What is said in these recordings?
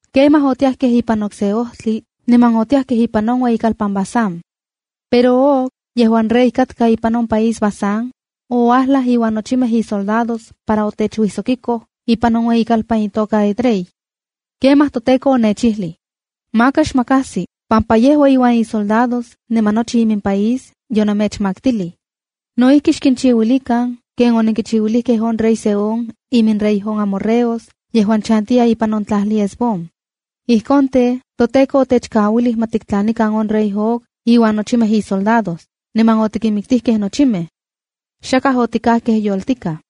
’Kemaj otiajkej ipan okse ojtli, niman otiajkej ipan on ueyitlalpan Basán. Pero Og, yejuan rey katka ipan on país Basán, ouajlaj iuan nochimej isoldados para otechuijsokiko ipan on ueyikalpan itoka Edrei. ’Kemaj toTEKO onechijlij: ‘Maka xmakajsi, pampa yejua iuan isoldados niman nochi imimpaís yonemechmaktilij. No ijki, xkinchiuilikan ken onenkichiuilijkej on rey Sehón iminrey on amorreos yejuan chantiya ipan on tlajli Hesbón.’ ’Ijkon tej, toTEKO Dios otechkauilij ma tiktlanikan on rey Og iuan nochimej isoldados. Niman otikinmiktijkej nochimej. Xakaj otikajkej yoltikaj.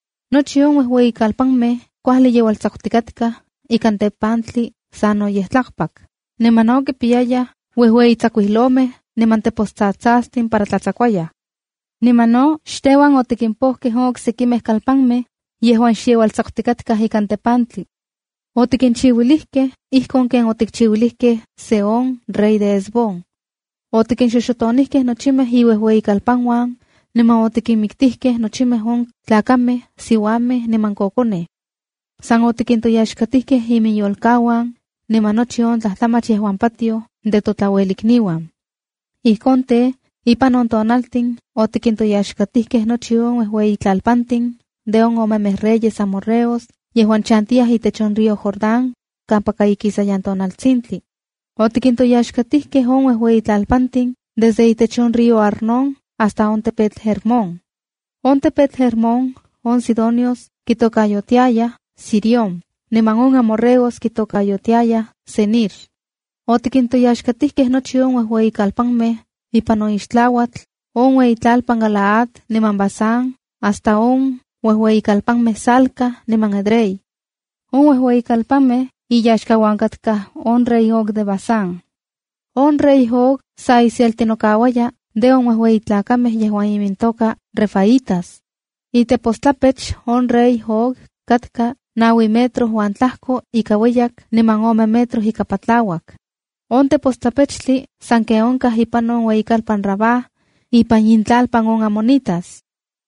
Nochi on uejueyikalpanmej kuajli yeualtsakutikatkaj ikan tepantli sanoyej tlakpak, niman no kipiyayaj uejueyi tsakuilomej niman tepostsatsastin para tlatsakuayaj. Niman no xteuan otikimpojkej on oksekimej kalpanmej yejuan xyeualtsakutikatkaj ikan tepantli. Otikinchiuilijkej ijkon ken otikchiuilijkej Sehón rey de Hesbón. Otikinxoxotonijkej nochimej iuejueyikalpanuan, niman otikinmiktijkej nochimej on tlakamej, siuamej niman kokonej. San otikintoyaxkatijkej iminyolkauan, niman nochi on tlajtlamach yejuan patioj de totlauelikniuan. ’Ijkon tej, ipan on tonaltin otikintoyaxkatijkej nochi on uejueyitlalpantin de on omemej reyes amorreos yejuan chantiyaj itech on río Jordán, kampaka ikisayan tonaltsintli. Otikintoyaxkatijkej on uejueyitlalpantin desde itech on río Arnón hasta on tepetl Hermón. (On tepetl Hermón, on sidonios kitokayotiaya Sirión, niman on amorreos kitokayotiayaj Senir.) Otikintoyaxkatijkej nochi on uejueyikalpanmej ipan on ixtlauatl, on ueyitlalpan Galaad niman Basán hasta on uejueyikalpanmej Salca niman Edrei. On uejueyikalpanmej iyaxka katka on rey Og de Basán. ’On rey Og sa iselti nokauaya de on uejueyi tlakamej yejuan imintoka refaitas. Itepostlapech on rey Og katka naui metro uan tlajko ika ueyak niman ome metro ika patlauak. On tepostlapechtli sanken onkaj ipan on ueyikalpan Rabá, ipan intlalpan on amonitas.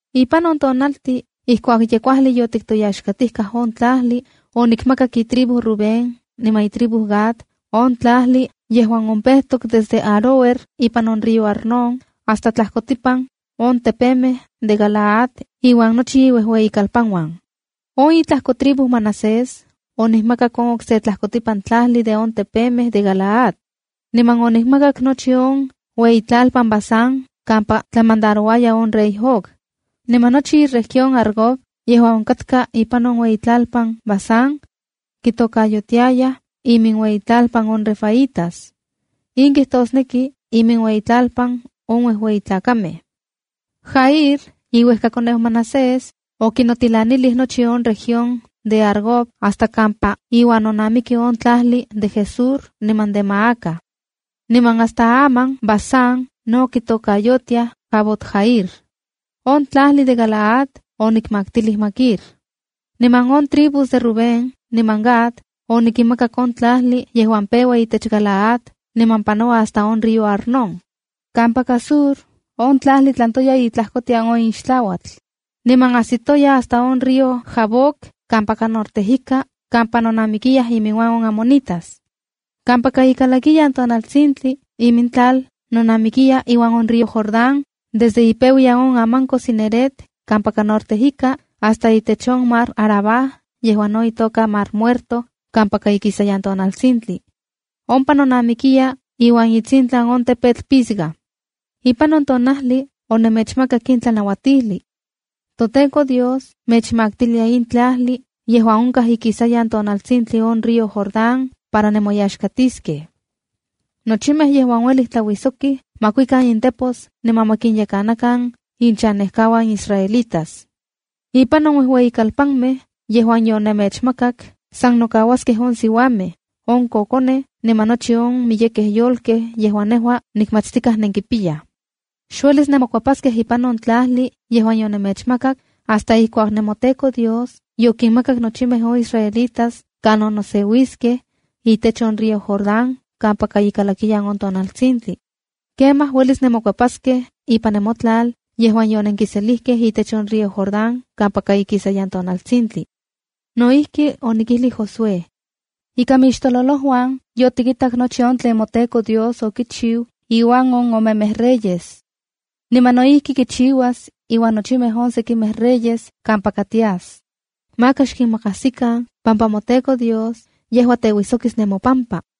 ’Ipan on tonaltin ijkuak ye kuajli yotiktoyaxkatijkaj on tlajli, onikmakak itribu Rubén niman itribu Gad, on tlajli yejuan ompejtok desde Aroer ipan on río Arnón, hasta tlajkotipan on tepemej de Galaad iuan nochi iuejueyikalpanuan. On itlajkotribu Manasés onikmakak on okse tlajkotipan tlajli de on tepemej de Galaad, niman onikmakak nochi on iueyitlalpan Basán kampa tlamandarouaya on rey Og. Niman nochi iueyitlalpan Argob yejuan onkakta ipan on iueyitlalpan Basán, kitokayotiayaj iminueyitlalpan on refaítas. In kijtosneki iminueyitlalpan on uejueyi tlakamej. Jair, iuejkakoneu Manasés, okinotilanilij nochi on región de Argob hasta kampa iuan nonamiki on tlajli de Gesur niman de Maaca. Niman hasta aman Basán no kitokayotiaj Havot-jair. On tlajli de Galaad onikmaktilij Maquir. Niman on tribus de Rubén niman Gad, onikinmakak on tlajli yejuan peua itech Galaad niman panoua hasta on río Arnón. Kampaka sur, on tlajli tlantoya itlajkotian on ixtlauatl, niman ajsitoya hasta on río Jaboc kampaka norte ika kampa nonamikiyaj iminuan on amonitas. Kampaka ikalakiyan tonaltsintli, imintlal nonamikiya iuan on río Jordán, desde ipeuyan on ananko Cineret kampaka norte ika, hasta itech on mar Arabá yejuan no itoka Mar Muerto kampaka ikisayan tonaltsintli. Ompa nonamikiya iuan itsintlan on tepetl Pisga. ’Ipan on tonajli onemechmakak in tlanauatijli: ‘ToTEKO Dios mechmaktilia in tlajli yejuan onkaj ikisayan tonaltsintli on río Jordan para nemoyaxkatiskej. Nochimej yejuan uelij tlauijsokij ma kuikan intepos niman ma kinyekanakan inchanejkauan israelitas. Ipan on uejueyikalpanmej yejuan yonemechmakak san nokauaskej on siuamej, on kokonej niman nochi on miyekej yolkej yejuan nejua nikmatstikaj nenkipiyaj. Xuelis nemokuepaskej ipan on tlajli yejuan yonemechmakak, hasta ijkuak nemoTEKO Dios yokinmakak nochimej on israelitas kanon noseuiskej, itech on río Jordán kampaka ikalakiyan on tonaltsintli. Kemaj, uelis nemokuepaskej ipan nemotlal yejuan yonenkiselijkej itech on río Jordán kampaka ikisayan tonaltsintli. ’No ijki, onikijlij Josué: ‘Ika mixtololojuan yotikitak nochi on tlen moTEKO Dios okichiu iuan on omemej reyes. Niman no ijki kichiuas iuan nochimej on sekimej reyes kampaka tias. Maka xkinmakajsikan pampa moTEKO Dios, yejua teuijsokis nemopampa.’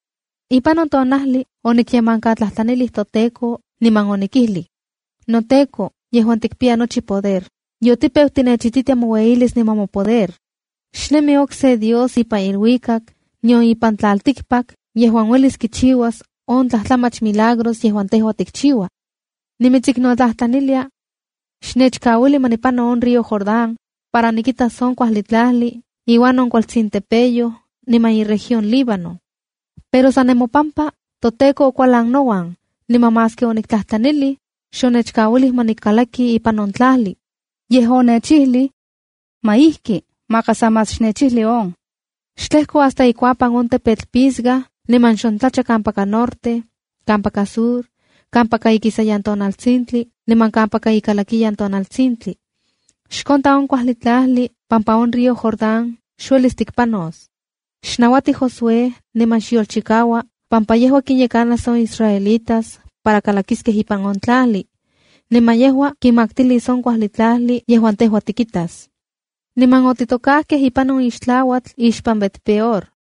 ’Ipan on tonajli onikyemankatlajtlanilij toTEKO niman onikijlij: ’NoTEKO yejuan tikpiya nochi poder, yotipeu tinechititia moueyilis niman mopoder. Xnemi okse Dios ipan iluikak, nion ipan tlaltikpak yejuan uelis kichiuas on tlajtlamach milagros yejuan tejua tikchiua. Nimitsiknotlajtlanilia: ‘Xnechkauili ma nikpano on río Jordán para nikitas on kuajli tlajli iuan on kualtsin tepeyoj niman iueyitlalpan Líbano.” ’Pero san nemopampa, toTEKO okualan nouan, niman maski oniktlajtlanilij, xonechkauilij ma nikalaki ipan on tlajli. Yej onechijlij: ‘¡Ma ijki! Maka sa más xnechijli on. Xtlejko hasta ikuapan on tepetl Pisga niman xontlacha kampaka norte, kampaka sur, kampaka ikisayan tonaltsintli niman kampaka ikalakiyan tonaltsintli. Xkonta on kuajli tlajli pampa on río Jordán xuelis tikpanos. Xnauati Josué niman xyolchikaua pampa yejua kinyekanas on israelitas para kalakiskej ipan on tlajli. Niman yejua kinmaktilis on kuajli tlajli yejuan tejua tikitas.’ ’Niman otitokajkej ipan on ixtlauatl ixpan Bet-peor.